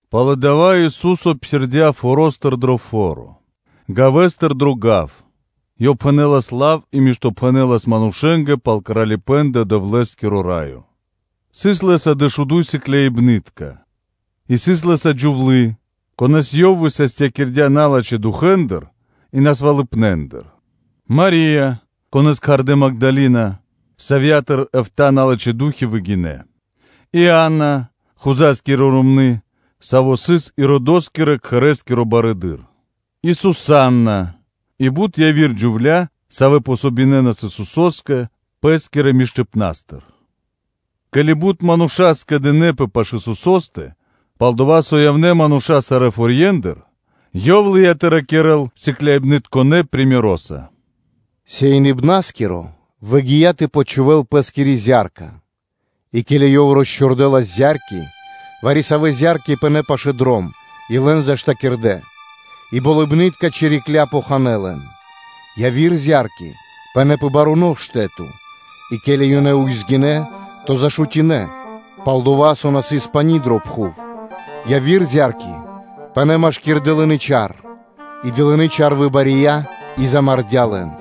Пало́ (после) дава́ Ису́со псирдя́ форо́стыр дро яви́р фо́ро, гавэстыр дро яви́р гав; Ёв пхэнэлас лав и миштопхэнэлас манушэ́нгэ пал Кралипэ́н дро Дэвлэ́скиро Раё; сыс Лэ́са дэшуду́й сыкляибны́тка; и сыс Лэ́са джувлы́, конэ́с Ёв высастякирдя́ налачхэ́ духэ́ндыр и насвалыпнэндыр: Мари́я, савья́ кхардэ́ Магдалина, савья́тыр эфта́ (битринэ́нгиро дэш) налачхэ́ ду́хи выгинэ́; Иана, Хузаскири ромны́, саво́ сыс Иродоскирэ-кхэрэ́скиро барыдыро́; и Сусанна, и бут яви́р джувля́, савэ́ помогинэнас Исусо́скэ пэ́скирэ миштыпна́стыр. Ке́ли бут мануша́ скэдынэ́пэ пашы́л Исусо́стэ, пал-дова́ со явнэ́ мануша́ сарэ́ форье́ндыр, Ёв лыя́ тэ ракирэ́л сыкляибнытконэ примероса (сыкаибнаса): “Сеиныбнаскиро выгия́ тэ почхувэл пэ́скири зя́рка, и, ке́ли ёв росчхурдэлас зя́рки, вари-савэ́ зя́рки пынэ́ пашэ́ дром и лэн заштакирдэ ґэрэ́нца, и болыбны́тка чирикля́ поханэ лэн; яви́р зя́рки пынэ́ пэ баруно штэ́то, и ке́ли ёнэ ўзгинэ, то зашутинэ, пал-дова́ со на сыс пани́ дро пхув; яви́р зя́рки пынэ́ машки́р дылыны чар, и дылыны чар выбария и замардя́ лэн.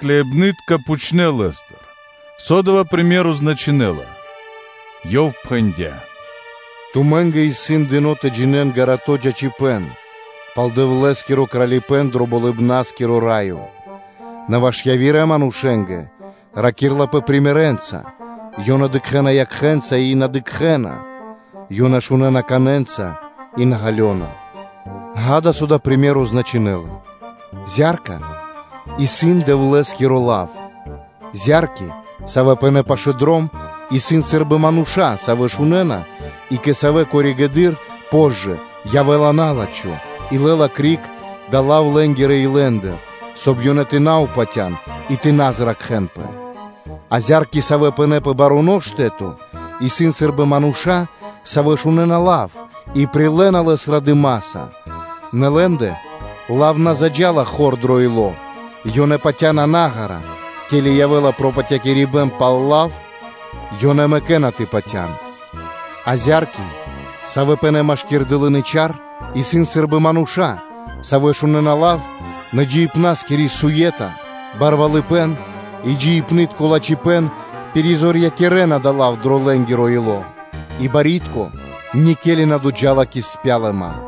Исусо́скирэ сыкляибны́тка пхучнэ́ Лэ́стыр, со дава́ приме́ро (сыкаибэ́н) значынэ́ла? Ёв пхэндя́: “Тумэ́нгэ исын дыно́ тэ джинэ́н чораханыбэн (гарадо́ чачипэ́н) пал Дэвлэ́скиро Кралипэ́н дро Болыбна́скиро Раё, нэ ваш явирэ манушэ́нгэ ракирлапэ примерэнца (сыкаибнэнца); ёнэ дыкхэ́на якхэ́нца, и на дыкхэ́на, ёнэ шунэ́на канэнца, и на ґалёна.” Ѓа́да, со дава́ сыкаибэ́н значынэ́ла: Зя́рка исын Дэвлэ́скиро лав. Зя́рки, савэ́ пынэ́ пашы́л дром, исын сы́рбы мануша́, савэ́ шунэ́на, и кэ савэ́ коригэды́р (позжэ) явэ́ла на́лачхо и лэ́ла криг дава́ лав лэ́нгирэ илэндыр, соб (кай) ёнэ тэ на упатян и тэ на зракхэнпэ; а зя́рки, савэ́ пынэ́ пэ баруно штэ́то, исын сы́рбы мануша́, савэ́ шунэ́на лав и прилэ́на лэс радыма́са; нэ лэ́ндэ лав на заджа́ла хор дро ило́, ёнэ патя́на наґара (длу́гэс), ке́ли явэ́ла пропатякирибэн пал лав, ёнэ мэкэ́на тэ патя́н; а зя́рки, савэ́ пынэ́ машки́р дылыны чар, исын сы́рбы мануша́, савэ́ шунэ́на лав, нэ джиибна́скири суе́та, барвалыпэ́н и джиибнытко лачхипэ́н замарэна дава́ лав дро лэ́нгиро ило́, а барьякирдо́ никели на доджа́ла кэ спялыма;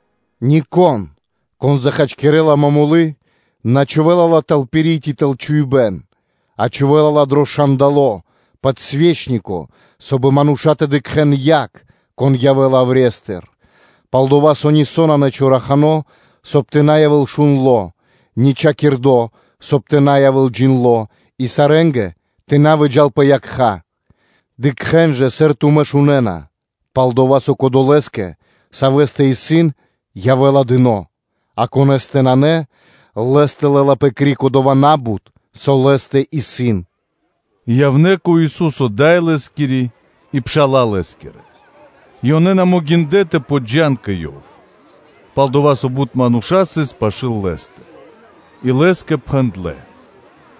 “Нико́н, кон захачкирэла момолы, на чхувэ́ла ла тэл пири́ ци тэл чхуибэ́н, а чхувэ́ла ла дро шандало (подсвечнико), соб (кай) мануша́ тэ дыкхэ́н яг, кон явэ́ла яврестыр, пал-дова́ со нисо́ нанэ чорахано, соб (кай) тэ на явэ́л шундло; ни чхакирдо, соб (кай) тэ на явэ́л джиндло́ и сарэ́нгэ тэ на выджа́л пэ якха́. Дыкхэ́н жа, сыр тумэ́ шунэ́на, пал-дова́ со кодолэ́скэ, савэ́стэ исын, явэ́ла дыно́, а конэ́стэ нанэ, лэ́стыр лэ́лапэ криг дова́ на́бут, со исын лэ́стэ.” И явнэ́ кэ Ису́со дай Лэ́скири и пша́ла Лэ́скирэ и ёнэ на могиндлэ́ тэ подджан кэ Ёв, пал-дова́ со бут мануша́ сыс пашы́л Лэ́стэ. И Лэ́скэ пхэндлэ́: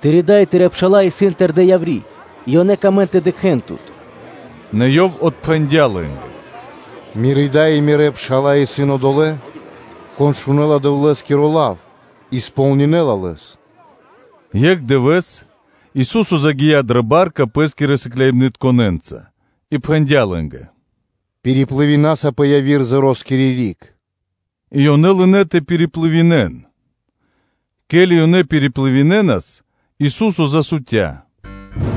“Тыри́ дай и Тырэ́ пша́ла исын тэрдэ́ яври́, и ёнэ камэ́на тэ дыкхэ́н Тут.” Нэ Ёв отпхэндя́ лэ́нгэ: “Мири́ дай и Мирэ́ пша́ла исын одолэ́, кон шунэ́ла Дэвлэ́скиро лав и сполнинэла лэс.” Екх дывэ́с, Ису́со загия́ дрэ ба́рка Пэ́скирэ сыкляибнытконэ́нца и пхэндя́ Лэ́нгэ: “Пириплывинаса (да́са пли́ма) пэ яви́р зероскири риг.” И ёнэ лынэ́ тэ пириплывинэн. Ке́ли ёнэ пириплывинэнас, Ису́со засутя.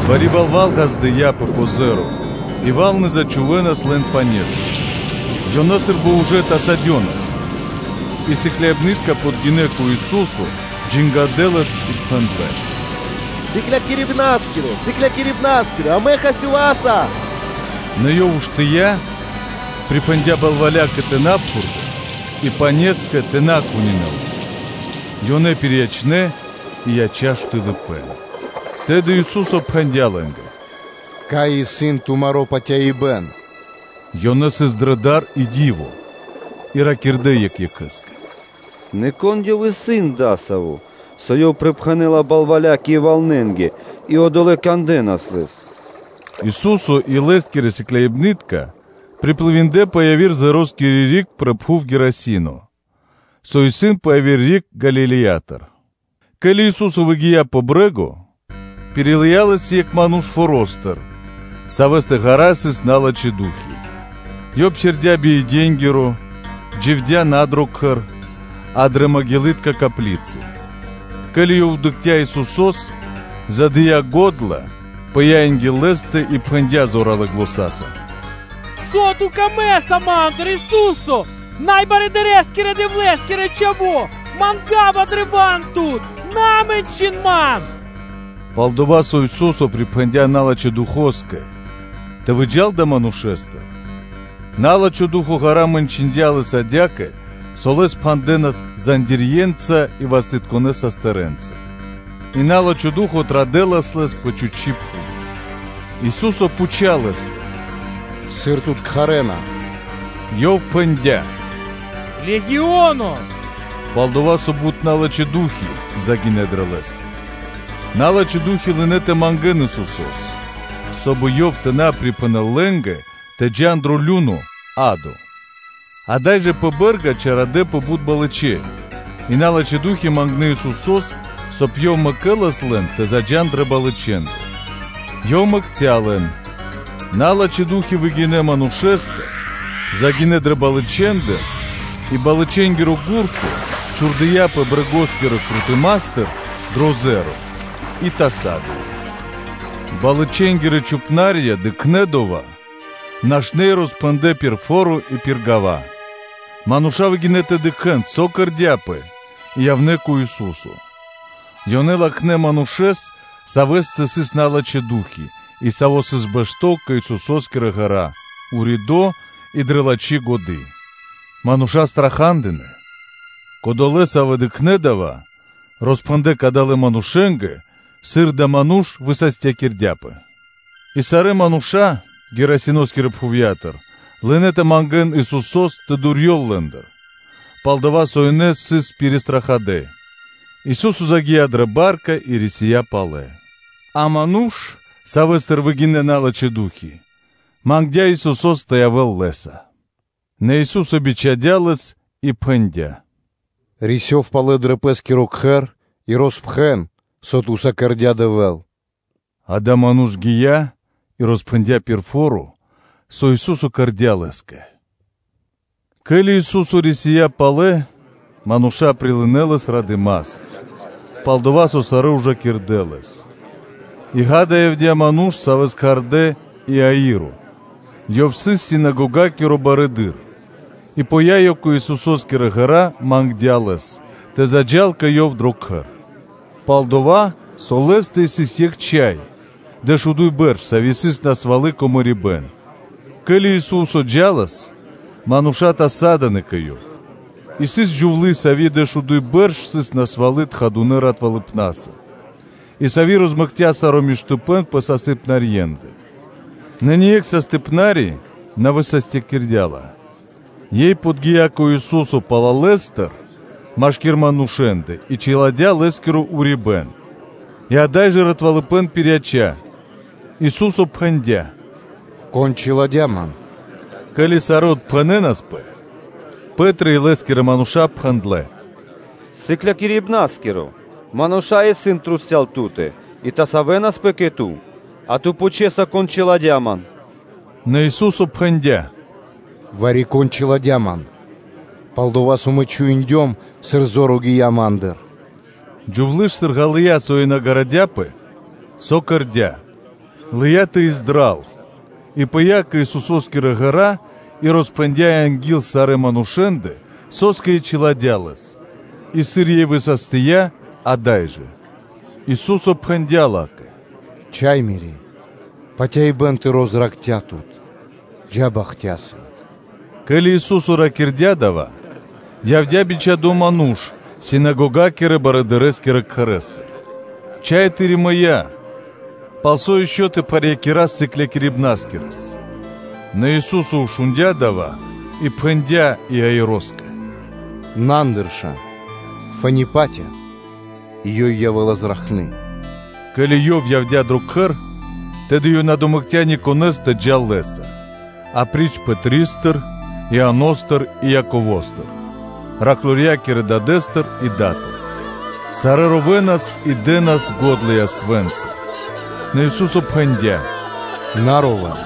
Бари балва́л пыя́ пэ зеро и валны зачхувэнас лэн пане́са, ёнэ сы́рбы ужэ тасадёнас; и сыкляибны́тка подгинэ́ кэ Ису́со, джангадэ Лэс и пхэндлэ́: “Сыклякирибна́скиро! Сыклякирибна́скиро! Амэ хасёваса” Нэ Ёв уштыя́, припхэндя́ балвалякэ тэ на пхурдэл и панескэ тэ на кунинэлпэ; ёнэ пириячнэ и яця́ штылыпэн. Тэды Ису́со пхэндя́ лэ́нгэ: “Кай исын тумаро́ патяибэ́н?” Ёнэ сыс дрэ дар и ди́во и ракирдэ́ екх екхэ́скэ: “Нэ Кон Ёв исын адасаво́, со Ёв припхэнэла балвалякэ и валнэнгэ, и одолэ́ кандэнас Лэс.” Ису́со и Лэ́скирэ сыкляибны́тка приплывиндлэ пэ яви́р зероскири риг пэ пхув Гадарино, со исын пэ яви́р риг Галилеятыр. Ке́ли Ису́со выгия́ пэ брэ́го, пирилыя Лэс екх ману́ш форо́стыр, савэ́стэ ґара́ сыс налачхэ́ ду́хи (фаны); ёв псирдя́ би иденгиро, дживдя́ на дро кхэр, а дрэ маґилытка коплицы. Ке́ли ёв дыкхця́ Исусо́с, задыя го́дла, пыя́ анги́л Лэ́стэ и пхэндя́ зоралэ́ заня́са: “Со Ту камэ́са ма́ндыр, Ису́се, Най Вучэдырэскирэ-Дэвлэ́скиро Чхаво́! Манга́ва древа́н Тут, на мэнчын ман.” Пал-дова́ со Ису́со припхэндя́ налачхэ́ духоскэ (фаноскэ) тэ выджа́л далэ́ манушэ́стыр; на́лачхо ду́хо (фа́но) ґара́ мэнчындя лэс адя́кэ, со лэс пхандэнас цэпэ́нца (зандирье́нца) и састырэнца пэ ґэра́; и на́лачхо ду́хо (фа́но) традэлас лэс пэ чхучи́ пхув.” Ису́со пхуця́ лэ́стыр: “Сыр тут кхарэ́на?” Ёв пхэндя́: “Легионо”, – палдова́ со бут налачхэ́ ду́хи (фаны) загинэ́ дрэ лэ́стэ. Налачхэ́ ду́хи лынэ́ тэ мангэ́н Исусо́с, соб (кай) Ёв тэ на припхэнэл лэ́нгэ тэ джа́н дро лю́но (адо). Ада́й жэ пэ бэ́рга чарадэпэ бут балычэ и налачхэ́ ду́хи мангнэ́ Исусо́с, соб (кай) Ёв тэ дэл во́ля лэ́нгэ тэ заджа́н дрэ балычэндэ. Ёв мэкця́ лэн. Налачхэ́ ду́хи выгинэ́ манушэ́стыр, загинэ́ дрэ балычэндэ; и балычэнгиро гурто чхурдыяпэ брэгоскирэ крутыматыр дро зеро и тасадыя. Балычэнгирэ чхупна́рья дыкхнэ́ дова́, нашнэ́ и роспхэндлэ́ пир фо́ро и пир гава́. Мануша́ выгинэ́ тэ дыкхэ́н, со кэрдя́пэ и явнэ́ кэ Ису́со, ёнэ латхнэ́ манушэ́с, савэ́стэ сыс налачхэ́ ду́хи (фаны), и саво́ сыс бэшто́ кэ Исусо́скирэ ґэра́ уридо́ и дрэ лачхи́ годы́; мануша́ страха́дынэ. Кодолэ́, савэ́ дыкхнэ́ дава́, роспхэндлэ́ кадалэ́ манушэ́нгэ, сыр адава́ ману́ш высастякирдяпэ. И сарэ́ мануша́ Гадариноскирэ пхувья́тыр лынэ́ тэ мангэ́н Исусо́с тэ дурьёл лэ́ндыр, пал-дова́ со ёнэ сыс пиристрахадэ. Ису́со загия́ дрэ ба́рка и рисия́ палэ. А ману́ш, савэ́стыр выгинэ́ налачхэ́ ду́хи (фаны), мангдя́ Исусо́с тэ явэ́л Лэ́са. Нэ Ису́со бичхадя́ лэс и пхэндя́: “Рисёв палэ дро пэ́скиро кхэр и роспхэн, со Ту́са кэрдя́ Дэвэ́л.” Адава́ ману́ш гия́ и роспхэндя́ пир фо́ро, со Ису́со кэрдя́ Лэ́скэ. Ке́ли Ису́со рисия́ палэ, мануша́ прилынэ́ Лэс радыма́са, пал-дова́ со сарэ́ ужакирдэ Лэс. И, ґа́да, явдя́ ману́ш, савэ́с кхардэ́ Иаиро, ёв сыс синагогакиро барыдыро́. И пыя́ ёв кэ Исусо́скирэ ґэра́, мангдя́ Лэс тэ заджа́л кэ ёв дро кхэр; пал-дова́ со лэ́стэ сыс екх чхай, дэшуду́й бэрш, сави́ сыс насвалы кэ мэрибэ́н. Ке́ли Исусо́с джа́лас, мануша́ тасадынэпэ кэ Ёв. И сыс джувлы́, сави́ дэшуду́й бэрш сыс насвалы тхадунэ ратвалыпнаса и, сави́ розмэкця саро́ миштыпэ́н пэ састыпнарьендэ, нэ ни екх састыпнари (докторо) на высастякирдя́ ла. Ёй подги́я кэ Ису́со палалэстыр машки́р манушэ́ндэ и чиладя́ Лэ́скиро урибэ́н, и ада́й жэ ратвалыпэн пирияця́. Ису́со пхэндя́: “Кон чиладя́ Ман?” Ке́ли сарэ́ отпхэнэнаспэ, Пэ́три и лэ́скирэ мануша́ пхэндлэ́: “Сыклякирибна́скиро! Мануша́ исын трусця́л (кругом) Ту́тэ, и ёнэ тасавэнаспэ кэ Ту, а Ту пхучэса: ‘Кон чиладя́ Ман?’” Нэ Ису́со пхэндя́: “Вари-кон чиладя́ Ман; пал-дова́ со Мэ чуиндём, сыр зор гия криг Ма́ндыр.” Джувлы́ ж, сыр ґалыя́, со ёй на гарадяпэ, со кэрдя́, лыя́ тэ издрал и пыя́ кэ Исусо́скирэ ґэра́ и роспхэндя́ анги́л сарэ́ манушэ́ндэ, со́скэ ёй чиладя́ Лэс и сыр ёй высастия ада́й жэ. Ису́со пхэндя́ ла́кэ: “Мири́ Чха́е! Патяибэ́н тыро́ зракхця́ тут! Джа́ бахтяса!” Ке́ли Ису́со ракирдя́ дава́, явдя́ бичхадо́ ману́ш синагогакирэ-барыдырэскирэ кхэрэ́стыр: “Чхай тыри́ мыя́, палсо́ ишчо (инкэ́) тэ пхарьякирэс Сыклякирибнаскирэс?” Нэ Ису́со шундя́ дава́ и пхэндя́ Иаироскэ: “На андырша, фэ́ни патя, и ёй явэлы зракхны.” Ке́ли Ёв явдя́ дро кхэр, тэды ёв на домэкця никонэ́с тэ джал Лэ́са апри́ч Пэтристэ, Ианостэ и Яковостэ, патывалэ́-тэрнэ́ джувлякирэ дадэ́стэ и датэ. Сарэ́ ровэнас и дэ́нас го́дла ясвэ́нца. Нэ Ису́со пхэндя́: “На ровэ́н;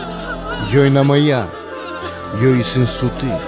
ёй на мыя́, ёй исын суты.”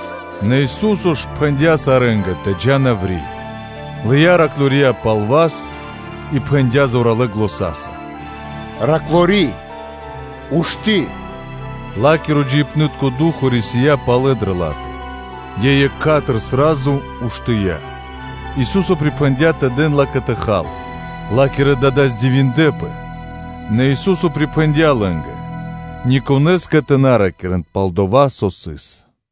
Нэ Ису́со ж пхэндя́ сарэ́нгэ тэ джа́н яври́, лыя́ тэрня патываля джувля́ пал васт и пхэндя́ зоралэ́ заня́са: “Патывалы́-Тэрны́-Джувли́е! Ушты́!” Ла́киро джиибнытко ду́хо (фа́но) рисия́ палэ дрэ ла́тэ; ёй екха́тыр (сра́зу) уштыя́; Ису́со припхэндя́ тэ дэн ла́кэ тэ хал. Ла́кирэ дада́ здивиндлэпэ, нэ Ису́со припхэндя́ лэ́нгэ ни конэ́скэ тэ на ракирэ́н пал дова́, со сыс.